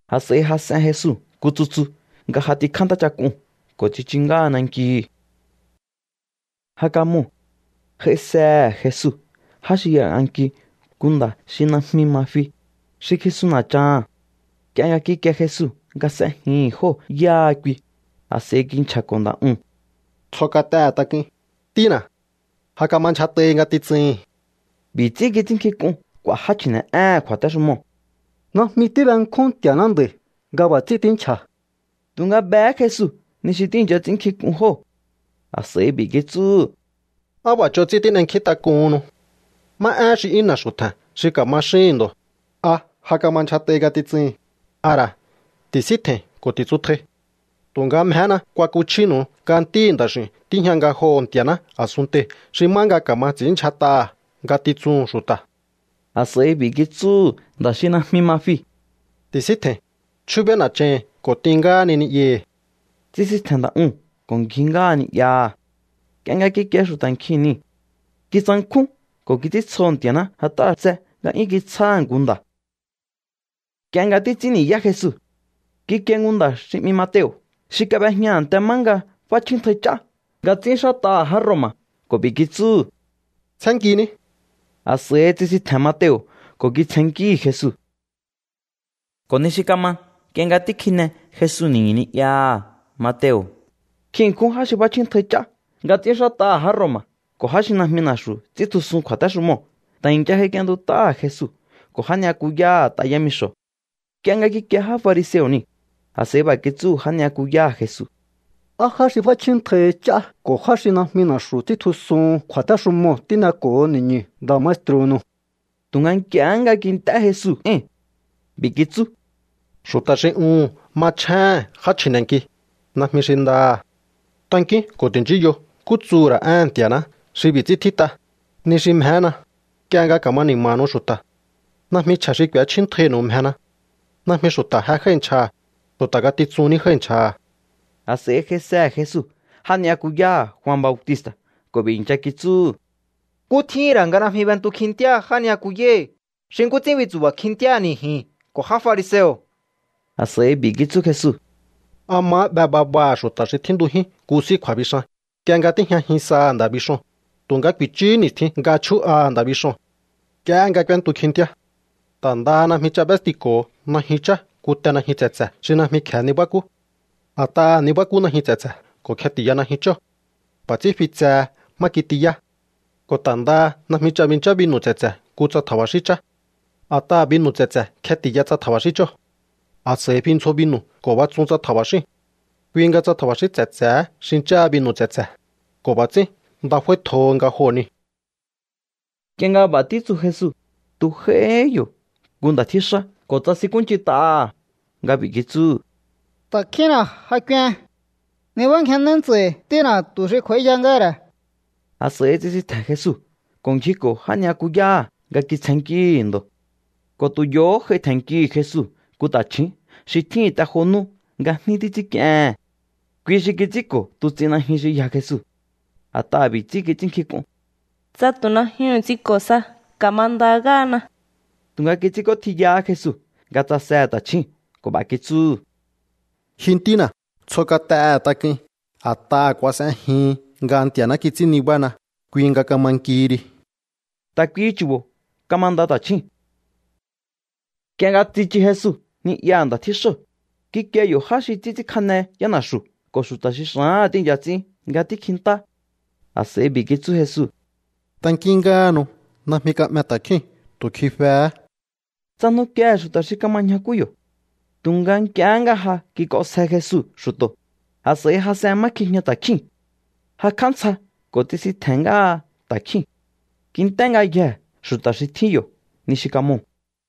A̱s'a̱i jas'en Jesu nku tsutsu nga j'atikjá ntáchak'uu̱n ko̱ tsichu ngáha nankihi. Ja kamoo̱. J'aisehe̱ Jesu já xi y'ang'anki nku nda̱ xi najmi ma fi, xi kjisun na̱chaha̱n. Nk'ie nga kikie Jesu nga s'ejihi̱n jóo̱ yáha kui, a̱s'a̱i kinchja̱ko̱ nda̱ uu̱n: —Tsjo kat'ehe̱ tak'uin, ntína̱. Ja kama ndyjat'ahi ngatitsuhi̱n. B'i̱ ts'ín kits'ínnkjink'un k'u̱a̱ já chji̱ne̱'éhe̱n kju̱a̱téxumoo̱: “Najmi tíbenkjún Nti̱a̱ná nda̱i̱ nga b'a̱ ts'ín tínchja̱.” Tu̱nga behé Jesu ni xi tíi̱ncha ts'ínnkjink'un jóo̱. A̱s'a̱i b'i̱ kitsúhu̱: —¿Á b'a̱ ch'on ts'ín tín'enkjíntak'uhunnu? ¿Má éhen xi 'yún na̱xu̱ tje̱n xi ka̱ma xíhi̱n ndo̱? ¿A: “Ja kama ndyjat'ahi ngatitsuhi̱n”? ¿A ra̱: “Ti̱síntje̱i̱n ko̱ ti̱tsutjai”? Tu̱nga mjehéna kuakuchjínu̱u nga Ntíhi̱ Nda̱x'i̱u̱n tíjña ngajoho̱ Nti̱a̱ná a̱sunntei̱ xi má nga ka̱ma ts'i̱ínndyjat'aha̱ ngatitsuhu̱n xu̱ta̱. A̱s'a̱i b'i̱ kitsúhu̱ nda̱ xi najmi ma fiu̱: —Ti̱síntje̱i̱n, chjúbéí na̱chahi̱n ko̱ t'in ngáhani ni'yahi̱. Tsisintje̱n nda̱ uu̱n ko̱ ngji ngáha ni'yaha̱. Nk'ie nga kikie xu̱ta̱ nkjiu̱n nii̱, kitsankjún ko̱ kits'íntsjoho̱ Nti̱a̱ná a̱t'aha̱ xu̱ b'a̱ tse nga'yún kitsjáha̱ nku nda̱. Nk'ie nga títs'ín ni̱yá Jesu, kikie nku nda̱ xi 'mi Mateo̱ xi kab'ejña a̱nte má nga f'áchjíntjai ch'á nga ts'ínxát'aha̱ já Roma̱ ko̱ b'i̱ kitsúhu̱: —Tsjénnkiní. A̱s'a̱i tsisintje̱n Mateo̱ ko̱ kitsjennkíhi̱ Jesu. Ko̱ ni xi kama, nk'ie nga tíkjine Jesu ni̱ñu̱ ni'yaha̱, nkjin ṉkjún já xi f'áchjíntjai ch'á nga ts'ínxát'aha̱ já Roma̱ ko̱ já xi najmi na̱xu̱ ts'íntjusun kju̱a̱téxumoo̱ ta̱ i̱ncha j'aik'ientut'áha̱ Jesu ko̱ já ni'yakuyáha̱ t'a yámixo̱. Nk'ie nga kikie já fariseo̱ nii̱, a̱s'a̱i b'a̱ kitsúhu̱ já ni'yakuyáha̱ Jesu: —¿Á já xi f'áchjíntjaihi ch'á ko̱ já xi najmi na̱xu̱ ts'íntjusuhun kju̱a̱téxumoo̱ tíneko̱ho ni̱ñu̱ nda̱ maestru̱nu̱u? Tu̱nga nk'iehé nga kint'é Jesu éi̱n, b'i̱ kitsú: —Xu̱ta̱ xi uhu̱n machjéhe̱n já chji̱ne̱nki, najmi xi ndaha̱. Tankíún ko̱ ti̱nchíyo nkú tsuhu̱ ra̱ éhe̱n Nti̱a̱ná xi b'i̱ ts'ín tjít'a: “Ni xi mjehéna, nk'ie nga ka̱ma ni̱ma̱nu̱u xu̱ta̱. Najmi chje̱ xi k'u̱échjíntjainu̱u mjena.” Najmi xu̱ta̱ je jái̱ nchjaha̱, xu̱ta̱ ngatitsun ní jái̱ nchjaha̱. A̱s'a̱i j'aisehe̱ Jesu já ni'yakuyáha̱ Jua Bautista̱ ko̱ b'i̱ i̱ncha kitsúhu̱: —¿Nkú tjíhi̱n ra̱ nga najmi b'entu kjintíáha já ni'yakuyáhi̱ xi nkú ts'ín bintsu̱ba̱ kjintíáha̱ni̱ ji̱n ko̱ já fariseo̱? A̱s'a̱i b'i̱ kitsú Jesu: —¿A mahá 'be babaha̱ xu̱ta̱ xi tjíntujín nku s'í kju̱a̱bixan nk'ie nga tíjñajin saha̱ nda̱ bixoo̱n? Tu̱nga ku̱i̱chúhú ni̱stjin nga chjú'aha̱ nda̱ bixoo̱n. Nk'iehé nga k'úéntu kjintíá. Ta̱ ndaha najmi ch'a b'éstiko̱ho najyun chá nku te najyun tse̱tse̱ xi najmi kje̱e nibákú. A̱t'aha̱ ni̱bakú najyun tse̱tse̱ ko̱ kjeti̱ya najyun chóo̱. B'a̱ ts'ín fi tsehe má kitiyá. Ko̱ ta̱ ndaha najmi ch'a binchá binu̱ tse̱tse̱ nku tsa tja̱ba̱xín chá. A̱t'aha̱ binu̱ tse̱tse̱ kjeti̱ya tsa tja̱ba̱xín chóo̱. A̱s'a̱i fi ndzjo binu̱ ko̱ batsun tsa tja̱ba̱xíu̱n. Kui nga tsa tja̱ba̱xín tse̱tse̱hé xincháha binu̱ tse̱tse̱, ko̱ b'a̱ ts'ín nda f'áítjoho nga joo̱ niu̱. Nk'ie nga b'a̱ títsu Jesu, tu̱ j'aihí yo̱ nku nda̱ tjíxá ko̱ tsasinkúnch'int'aha̱ nga b'i̱ kitsúhu̱: —Ta̱kjínna ja k'uen. Nibángjennéí ntsa̱i̱ ntína̱ tu̱ xi kj'u̱a̱íya ngáha̱ ra̱. A̱s'a̱i tsisintje̱n Jesu ko̱ ngjiko̱ já ni'yakuyáha̱ nga kitsjennkíhi̱ ndo̱. Ko̱ tu̱ yo̱hó j'ai tje̱nnkihi̱ Jesu nku ta̱chju̱ún xi tjíhi̱n te jo nú nga jní títs'ínk'iehe̱n. Kui xi kits'ínko̱ tuts'in najyun xi yja Jesu. A̱t'aha̱ b'i̱ ts'ín kits'ínnkjink'un: “Tsa tu̱ najyuhu̱n ts'inko̱ sa, ka̱manda ngáhana.” Tu̱nga kits'ínk'ótjiyahá Jesu nga tsasehe̱ ta̱chjúu̱n ko̱ b'a̱ kitsúhu̱: —Ji ntína̱, tsjo kat'ehe̱ tak'uin. A̱t'aha̱ kuas'ejihin nga Nti̱a̱ná kits'ín nibána, kui nga kama nkihi ri. Ta̱ kuihi chu̱bo̱ kamanda ta̱chjúu̱n. Nk'ie nga tsichu Jesu ni'yaha̱ nda̱ tjíxóo̱, kikie yo̱ já xi títs'ínkjane yána̱xu̱ ko̱ xu̱ta̱ xi xa̱áha̱n tíi̱ncha ts'ín nga tíkjintá. A̱s'a̱i b'i̱ kitsú Jesu: —Tankín ngáhanu. Najmi ka'me ta̱kjíu̱n. Tu̱ kjifehé. Tsajnukiehe̱ xu̱ta̱ xi kama ñjakú yo̱. Tu̱nga nk'iehé nga ja kik'onsje Jesu xu̱to̱, a̱s'a̱i jas'en má kjijña ta̱kjíu̱n, jakj'á ntsja ko̱ tsisintje̱n ngáha ta̱kjíu̱n. Kint'é ngayjee̱ xu̱ta̱ xi tjín yo̱ ni xi kamoo̱.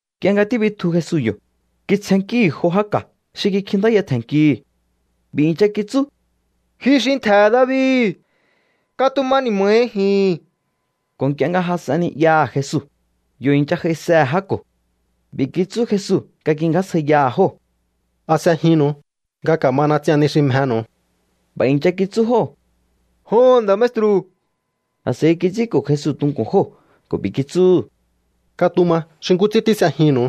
Nk'ie nga tíbitju Jesu yo̱, kitsjennkíhi̱ jo já ka̱ xi kikjintáya tje̱nnkihi̱. B'i̱ i̱ncha kitsú: —Ji xi ntje̱he̱ David, katuma ni̱ma̱hi ji̱n. Ko̱ nk'ie nga jas'en ni'yaha̱ Jesu, yo̱ i̱ncha j'aisehe̱ já ko̱. B'i̱ kitsú Jesu nga kingjásjaiyaha̱ jóo̱: —¿A s'ejinnu̱u nga ka̱mana ts'ian ni xi mjenu̱u? B'a̱ i̱ncha kitsú jóo̱: —Joho̱n, nda̱ maestru̱. A̱s'a̱i kits'ínko̱ Jesu tunku̱n jóo̱ ko̱ b'i̱ kitsúhu̱: —Katuma xi nkú ts'ín tís'ejinnu̱u.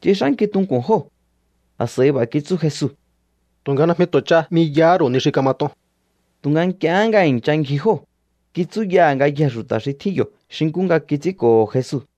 Tsix'ánki tunku̱n jóo̱. A̱s'a̱i b'a̱ kitsú Jesu: —Tu̱nga najmi tu̱ ch'a 'miyahá ru̱u ni kamat'on. Tu̱nga nk'iehé nga i̱ncha ngji jóo̱, kitsúyaha̱ ngayjee̱ xu̱ta̱ xi tjín yo̱ xi nkú nga kits'ínko̱ho̱ Jesu.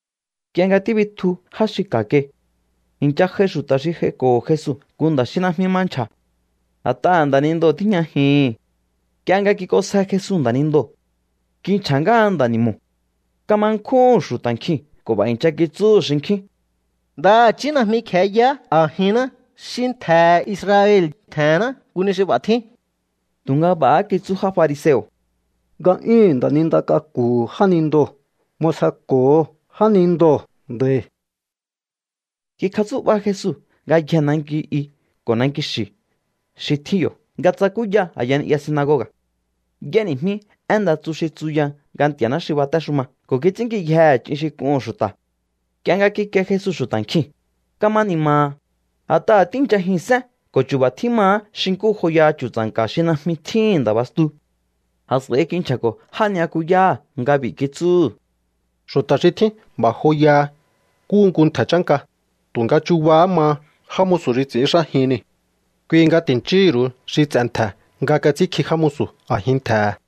Nk'ie nga tíbitju já xi ka̱ kai, i̱ncha j'ai xu̱ta̱ xi j'aiko̱ho̱ Jesu nku nda̱ xi najmi ma nchja̱, a̱t'aha̱ nda̱nindoo̱ tíjñajihi̱n. Nk'ie nga kik'onsje Jesu nda̱nindoo̱, kinchja̱ ngáha nda̱ ni̱mo̱. Kama nkjúhu̱n xu̱ta̱ nkjiu̱n ko̱ b'a̱ i̱ncha kitsúhu̱ xinkjín: —Ndaha̱chí najmi kje̱e yaá a̱jinná xi ntje̱he̱ Israel tjenná nku ni xi b'a̱ tjín. Tu̱nga b'a̱há kitsú já fariseo̱: —Nga'yúhu̱n nda̱ninda k'aku̱hu̱ jánindoo̱ m'osjeko̱ho jánindoo̱ nda̱i̱. Kikjatsú'ba Jesu ngayjee̱ nanki i ko̱ nanki xi̱ xi tjín yo̱ nga tsakúya a̱ya ni'ya sinagoga̱. Y'éni̱jmí én nda tsu xi títsuya nga Nti̱a̱ná xi batéxuma ko̱ kits'ínnkiyjehe̱ ch'in xi k'uhu̱n xu̱ta̱. Nk'ie nga kikie Jesu xu̱ta̱ nkjiu̱n, kama ni̱ma̱ha̱, a̱t'aha̱ tíi̱nchajihi̱n sén ko̱ chu̱ba̱ tjímahá xi nkú joyaha chu̱tsa̱nka̱ xi najmi tjíhi̱n nda̱ bastu. A̱s'a̱i kinchja̱ko̱ já ni'yakuyáha̱ nga b'i̱ kitsúhu̱: —Xu̱ta̱ xi tjín b'a̱ joyaha nkúhu nku ntje̱ chánka, tu̱nga chubahá maha já musu̱ xi ts'i̱ínxájin nii̱. Kui nga ti̱nchíhi̱ ru̱u xi ts'e̱ ntje̱ nga kats'ínkji já musu̱ a̱jin ntje̱he̱.